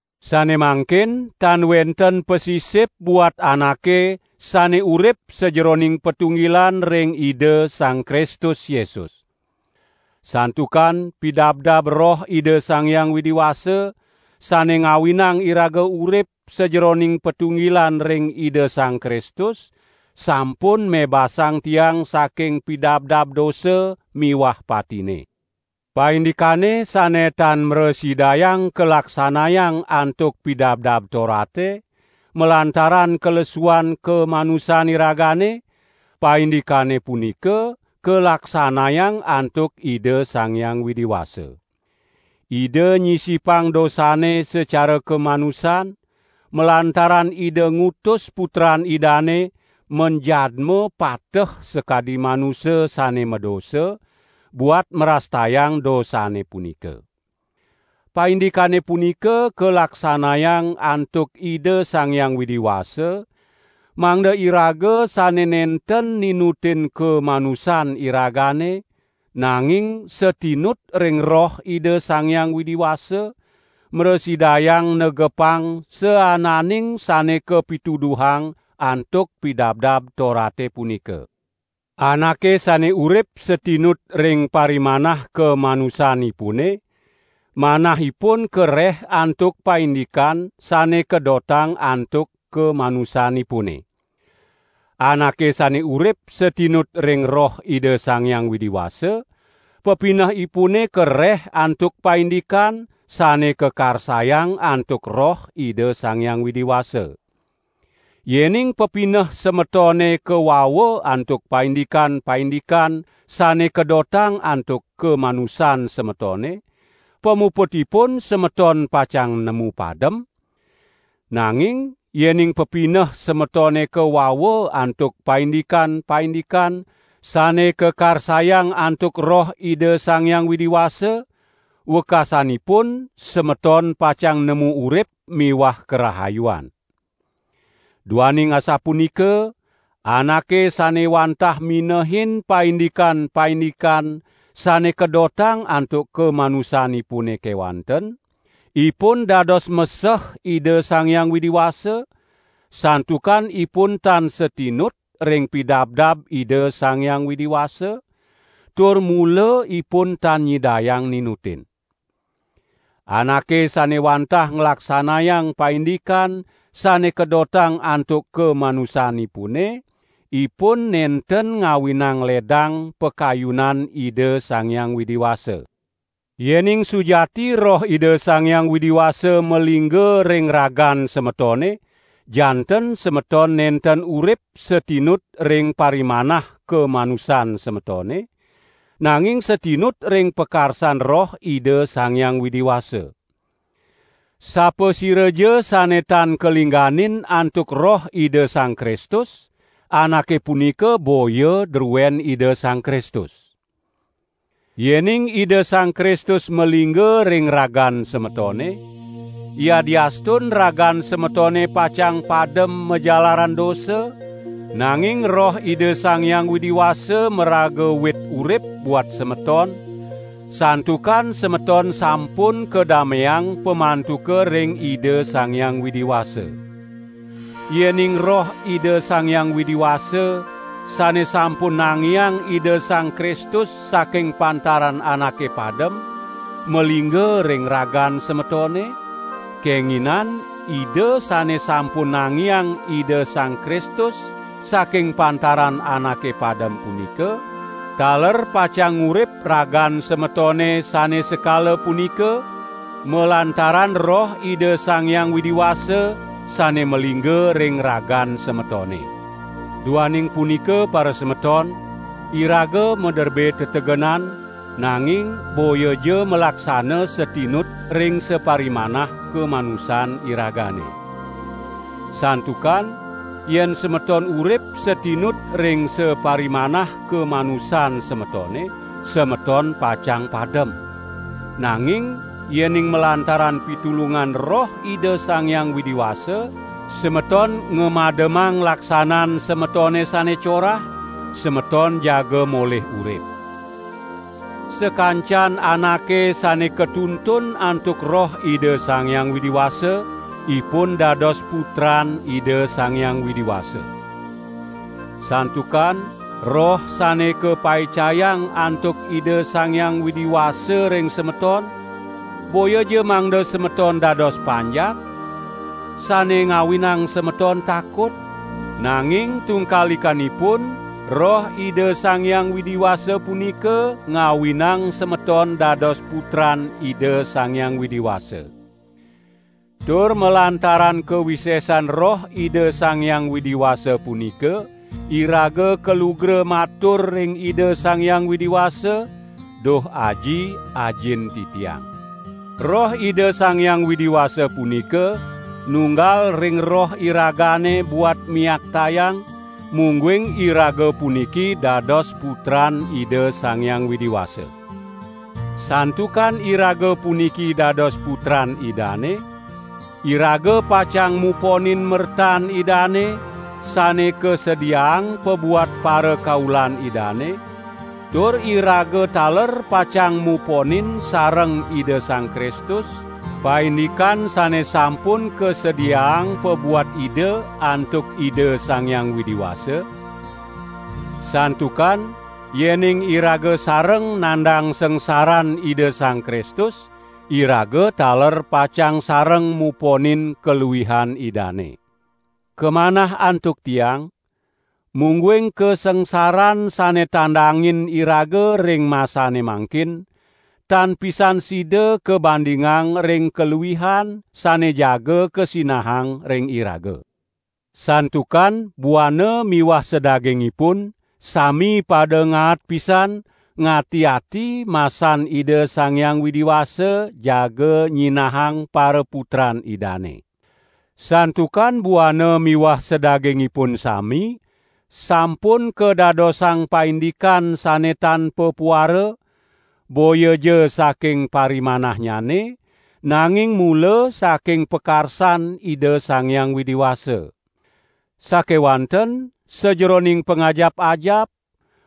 Sane mangkin tan wenten pasisip buat anake sane urip sajeroning patunggilan ring Ida Sang Kristus Yesus. Santukan pidabdab Roh Ida Sang Hyang Widi Wasa, sane ngawinang iraga urip sajeroning patunggilan ring Ida Sang Kristus, sampun mebasang tiang saking pidabdab dosa miwah patine. Paindikane sane tan mrasidayang kalaksanayang antuk Pidabdab Torate, malantaran kalesuan kamanusan iragane, paindikane punika kalaksanayang antuk Ida Sang Hyang Widi Wasa. Ida nyisipang dosane sacara kamanusan, malantaran Ida ngutus Putran Idane manjadma pateh sakadi manusa sane madosa, buat mrastayang dosane punika. Paindikane punika kalaksanayang antuk Ida Sang Hyang Widi Wasa, mangda iraga sane nenten ninutin kamanusan iragane, nanging satinut ring Roh Ida Sang Hyang Widi Wasa, mrasidayang negepang saananing sane kapituduhang antuk Pidabdab Torate punika. Anake sane urip satinut ring parimanah kamanusanipune, manahipun kareh antuk paindikan sane kadotang antuk kamanusanipune. Anake sane urip satinut ring Roh Ida Sang Hyang Widi Wasa, pepineh ipune kareh antuk paindikan sane kakarsayang antuk Roh Ida Sang Hyang Widi Wasa. Yening pepineh semetone kawawa antuk paindikan-paindikan sane kadotang antuk kamanusan semetone, pamuputipun semeton pacang nemu padem; nanging yening pepineh semetone kawawa antuk paindikan-paindikan sane kakarsayang antuk Roh Ida Sang Hyang Widi Wasa, wekasanipun semeton pacang nemu urip miwah karahayuan. Duaning asapunika anake sane wantah minehin paindikan-paindikan sane kadotang antuk kamanusanipune kewanten, ipun dados meseh Ida Sang Hyang Widi Wasa, santukan ipun tan satinut ring pidabdab Ida Sang Hyang Widi Wasa, tur mula ipun tan nyidayang ninutin. Anake sane wantah nglaksanayang paindikan sane kadotang antuk kamanusanipune, ipun nenten ngawinang ledang pakayunan Ida Sang Hyang Widi Wasa. Yening sujati Roh Ida Sang Hyang Widi Wasa malingga ring ragan semetone janten semeton nenten urip satinut ring parimanah kamanusan semetone, nanging satinut ring pakarsan Roh Ida Sang Hyang Widi Wasa. Sapasiraja sane tan kalingganin antuk Roh Ida Sang Kristus, anake punika boya druen Ida Sang Kristus. Yening Ida Sang Kristus malingga ring ragan semetone, yadiastun ragan semetone pacang padem majalaran dosa, nanging Roh Ida Sang Hyang Widi Wasa maraga wit urip buat semeton, santukan semeton sampun kadameang pamantuka ring Ida Sang Hyang Widi Wasa. Yening Roh Ida Sang Hyang Widi Wasa, sane sampun nangiang Ida Sang Kristus saking pantaran anake padem, malingga ring ragan semetone, kenginin Ida sane sampun nangiang Ida Sang Kristus saking pantaran anake padem punika, taler pacang ngurip ragan semetone sane sekala punika, malantaran Roh Ida Sang Hyang Widi Wasa sane malingga ring ragan semetone. Duaning punika parasemeton, iraga maderbe tetegenan, nanging boyaja malaksana satinut ring saparimanah kamanusan iragane. Santukan yen semeton urip satinut ring saparimanah kamanusan semetone, semeton pacang padem; nanging yening malantaran pitulungan Roh Ida Sang Hyang Widi Wasa semeton ngamademang laksanan semetone sane corah, semeton jaga molih urip. Sakancan anake sane katuntun antuk Roh Ida Sang Hyang Widi Wasa ipun dados putran Ida Sang Hyang Widi Wasa. Santukan Roh sane kapaicayang antuk Ida Sang Hyang Widi Wasa ring semeton, boyaja mangda semeton dados panjak, sane ngawinang semeton takut; nanging tungkalikanipun Roh Ida Sang Hyang Widi Wasa punika ngawinang semeton dados putran Ida Sang Hyang Widi Wasa. Tur malantaran kawisesan Roh Ida Sang Hyang Widi Wasa punika iraga kalugra matur ring Ida Sang Hyang Widi Wasa: "Duh Aji, Ajin titiang." Roh Ida Sang Hyang Widi Wasa punika nunggal ring roh iragane buat miaktayang, mungguing iraga puniki dados putran Ida Sang Hyang Widi Wasa. Santukan iraga puniki dados putran Idane, iraga pacang muponin mertan Idane sane kasediaang pabuat parakaulan Idane, tur iraga taler pacang muponin sareng Ida Sang Kristus, paindikan sane sampun kasediaang pabuat Ida antuk Ida Sang Hyang Widi Wasa; santukan yening iraga sareng nandang sangsaran Ida Sang Kristus, iraga taler pacang sareng muponin kaluihan Idane. Kamanah antuk tiang, mungguing kasangsaran sane tandangin iraga ring masane mangkin, tan pisan sida kabandingang ring kaluihan sane jaga kasinahang ring iraga. Santukan buana miwah sadagingipun sami pada ngaat pisan ngati-ati masan Ida Sang Hyang Widi Wasa jaga nyinahang paraputran Idane. Santukan buana miwah sadagingipun sami, sampun kadadosang paindikan sane tan papuara, boyaja saking parimanahnyane, nanging mula saking pakarsan Ida Sang Hyang Widi Wasa. Sakewanten sajeroning pangajap-ajap,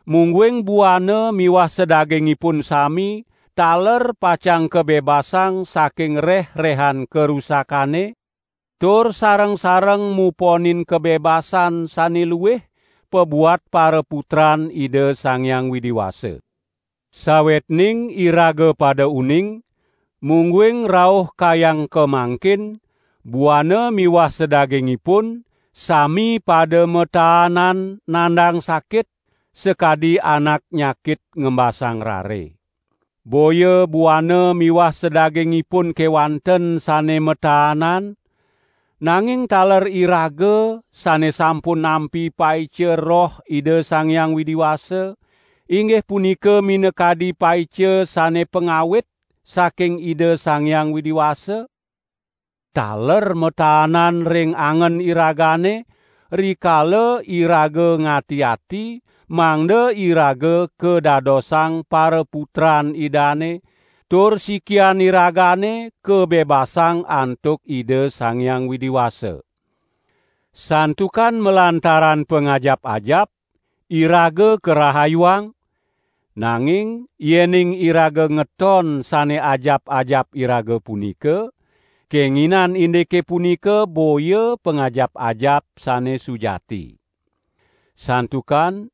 mungguing buana miwah sadagingipun sami taler pacang kabebasang saking reh-rehan karusakane, tur sareng-sareng muponin kabebasan sane luih pabuat paraputran Ida Sang Hyang Widi Wasa. Sawetning iraga pada uning, mungguing rauh kayang kamangkin, buana miwah sadagingipun sami pada mataanan nandang sakit, sakadi anak nyakit ngembasang rare. Boya buana miwah sadagingipun kewanten sane mataanan; nanging taler iraga sane sampun nampi paica Roh Ida Sang Hyang Widi Wasa, inggih punika minakadi paica sane pangawit saking Ida Sang Hyang Widi Wasa, taler mataanan ring angen iragane, rikala iraga ngati-ati mangda iraga kadadosang paraputran Idane tur sikian iragane kabebasang antuk Ida Sang Hyang Widi Wasa. Santukan malantaran pangajap-ajap, iraga karahayuang; nanging yening iraga ngeton sane ajap-ajap iraga punika, kenginan indike punika boya pangajap-ajap sane sujati. Santukan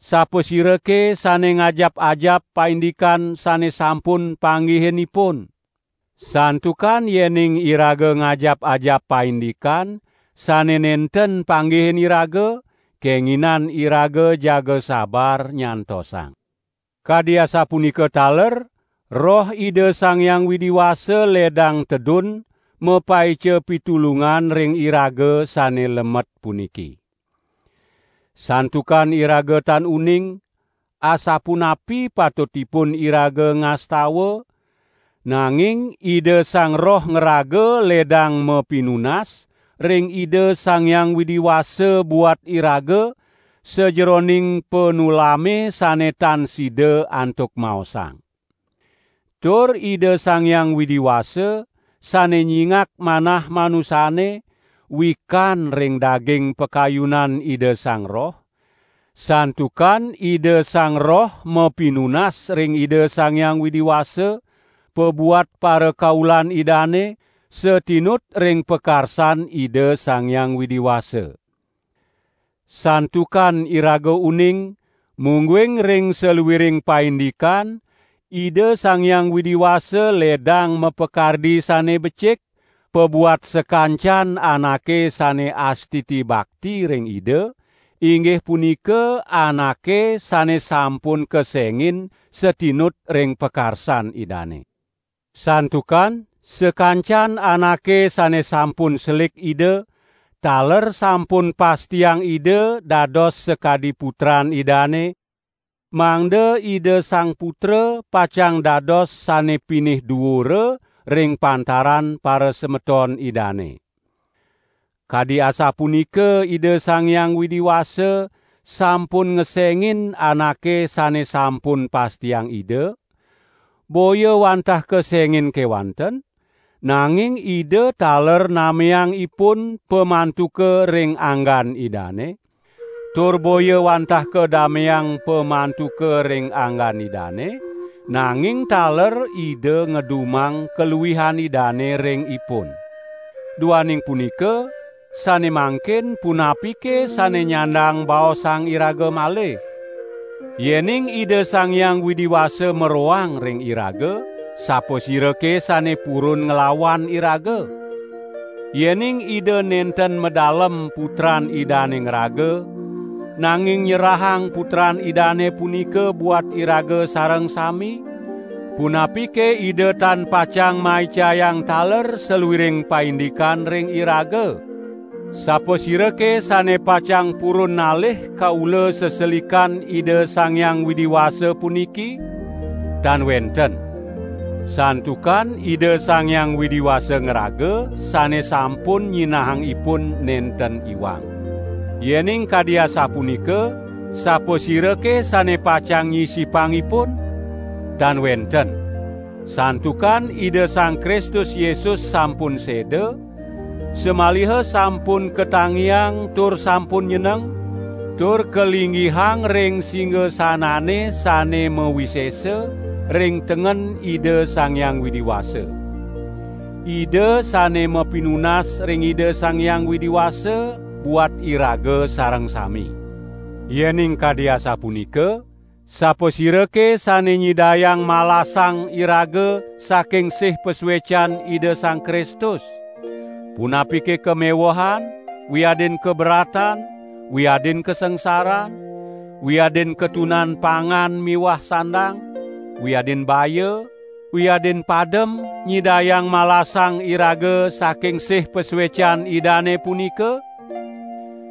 sapasirake sane ngajap-ajap paindikan sane sampun panggihin ipun? Santukan yening iraga ngajap-ajap paindikan sane nenten panggihin iraga, kenginan iraga jaga sabar nyantosang. Kadi asapunika taler Roh Ida Sang Hyang Widi Wasa ledang tedun mapaica pitulungan ring iraga sane lemet puniki. Santukan iraga tan uning, asapunapi patutipun iraga ngastawa; nanging Ida Sang Roh ngraga ledang mapinunas ring Ida Sang Hyang Widi Wasa buat iraga, sajeroning panulame sane tan sida antuk maosang. Tur Ida Sang Hyang Widi Wasa, sane nyingak manah manusane, wikan ring daging pakayunan Ida Sang Roh; santukan Ida Sang Roh mapinunas ring Ida Sang Hyang Widi Wasa, pabuat parakaulan Idane, satinut ring pakarsan Ida Sang Hyang Widi Wasa. Santukan iraga uning, mungguing ring saluiring paindikan Ida Sang Hyang Widi Wasa ledang mapakardi sane becik pabuat sakancan anake sane astiti bakti ring Ida, inggih punika anake sane sampun kesengin satinut ring pakarsan Idane. Santukan sakancan anake sane sampun selik Ida, taler sampun pastiang Ida dados sakadi putran Idane, mangda Ida Sang Putra pacang dados sane pinih duura ring pantaran parasemeton Idane. Kadi asapunika Ida Sang Hyang Widi Wasa sampun ngesengin anake sane sampun pastiang Ida; boya wantah kesengin kewanten, nanging Ida taler nameang ipun pamantuka ring anggan Idane; tur boya wantah kadameang pamantuka ring anggan Idane, nanging taler Ida ngedumang kaluihan Idane ring ipun. Duaning punika, sane mangkin punapike sane nyandang baosang iraga malih? Yening Ida Sang Hyang Widi Wasa maroang ring iraga, sapasirake sane purun nglawan iraga? Yening Ida nenten madalem Putran Idane ngraga, nanging nyerahang Putran Idane punika buat iraga sareng sami, punapike Ida tan pacang maicayang taler saluiring paindikan ring iraga? Sapasirake sane pacang purun nalih kaula seselikan Ida Sang Hyang Widi Wasa puniki? Tan wenten. Santukan Ida Sang Hyang Widi Wasa ngraga sane sampun nyinahang ipun nenten iwang. Yening kadi asapunika sapasirake sane pacang nyisipang ipun? Tan wenten! Santukan Ida Sang Kristus Yesus sampun seda, samaliha sampun katangiang tur sampun nyeneng, tur kalinggihang ring singasanane sane mawisesa ring tengen Ida Sang Hyang Widi Wasa. Ida sane mapinunas ring Ida Sang Hyang Widi Wasa buat iraga sareng sami! Yening kadi asapunika, sapasirake sane nyidayang malasang iraga saking sih pasuecan Ida Sang Kristus? Punapike kamewehan, wiadin kaberatan, wiadin kasangsaran, wiadin katunan pangan miwah sandang, wiadin baya, wiadin padem, nyidayang malasang iraga saking sih pasuecan Idane punika?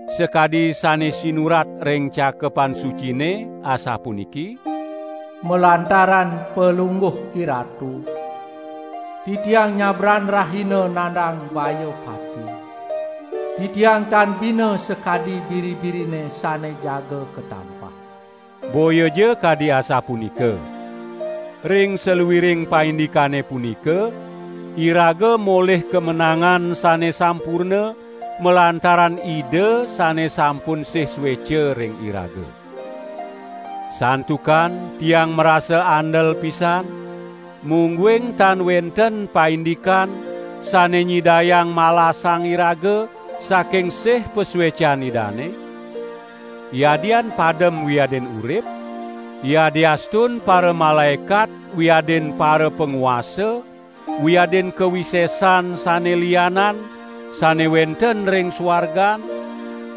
Sakadi sane sinurat ring Cakepan Sucine, asapuniki: "Malantaran Palungguh IRatu, titiang nyabran rahina nandang baya pati, titiang tan bina sakadi biri-birine sane jaga katampah." Boyaja kadi asapunika. Ring saluiring paindikane punika, iraga molih kamenangan sane sampurna malantaran Ida sane sampun sih sueca ring iraga. Santukan tiang marasa andel pisan, mungguing tan wenten paindikan sane nyidayang malasang iraga saking sih pasuecan Idane; yadian padem wiadin urip, yadiastun paramalaekat wiadin parapanguasa wiadin kawisesan sane lianan sane wenten ring suargan,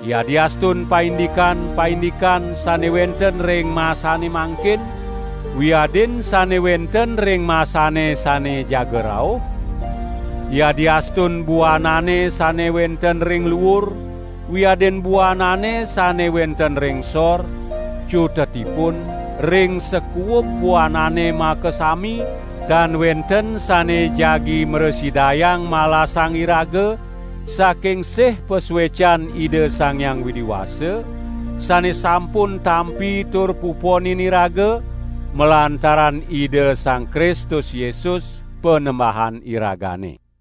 yadiastun paindikan-paindikan sane wenten ring masane mangkin wiadin sane wenten ring masane sane jaga rauh, yadiastun buanane sane wenten ring luur wiadin buanane sane wenten ring sor, cutetipun ring sakuub buanane makasami tan wenten sane jagi mrasidayang malasang iraga saking sih pasuecan Ida Sang Hyang Widi Wasa, sane sampun tampi tur puponin iraga, malantaran Ida Sang Kristus Yesus, Panembahan iragane.